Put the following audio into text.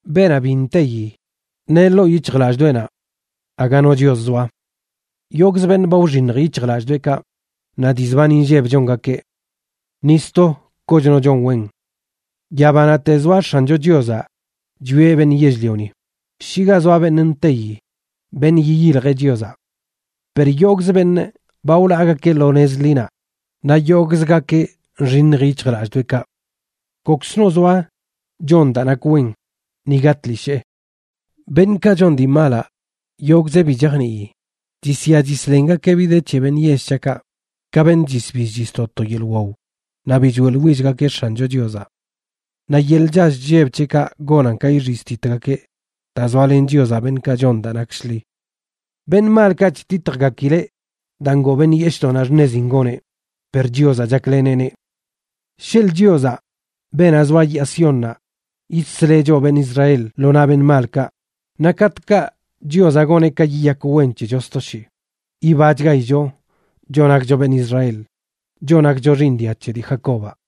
Beenaꞌ bi nteyi, neꞌ ḻoo yic̱hjlallꞌdoꞌenaꞌ: “Aga no Chios zoa.” Yogꞌzə beṉꞌ ba wxiṉj yic̱hjlallꞌdoꞌekaꞌ, naꞌ dii zban inlleb chongakeꞌ. ¡Ni sto kochno chon wen! Yabanaꞌte zoaꞌ X̱ancho Chiozaꞌ chwieꞌ beṉꞌ yell-lioni, shi ga zoa beṉꞌ nteyi, beṉꞌ yiyiljeꞌ Chiozaꞌ. Per yogꞌz beṉꞌ ba wlaagakeꞌ lo nez ḻinaꞌ, naꞌ yogꞌzgakeꞌ nxiṉj yic̱hjlallꞌdoꞌekaꞌ. ¡Kokzno zoa chon daa nak wen, niga tlishee! Beṉꞌkaꞌ chon dii malaꞌ, yogꞌzeꞌ bi chajnii. Chisya chislengakeꞌ bi de c̱he beṉꞌ yell c̱haꞌkaꞌ, ka beṉꞌ chisbill chisto to yeḻꞌ waw, naꞌ bi choeꞌḻwillgakeꞌ X̱ancho Chiozaꞌ. Naꞌ yeḻꞌ chall chlleb c̱heꞌkaꞌ gonan ka ixiztitgakeꞌ, daa zoalen Chiozaꞌ beṉꞌkaꞌ chon daa nak shḻi. Beṉꞌ malkaꞌ chtitjgakileꞌ daa ngoo beṉꞌ yeshꞌdoꞌnaꞌ xṉezin goneꞌ, per Chiozaꞌ chakleneꞌneꞌ. ¡Sheḻꞌ Chiozaꞌ, beenaꞌ zoa yaa Siónnaꞌ, yidsleꞌ choꞌ beṉꞌ Israel lo naꞌ beṉꞌ malkaꞌ! Naꞌ katꞌkaꞌ Chiozaꞌ goneꞌ ka yiyak wen c̱hecho sto shii, yibachgaicho choꞌ nakcho beṉꞌ Israel, choꞌ nakcho xiiṉ dia c̱he dii Jacobaꞌ.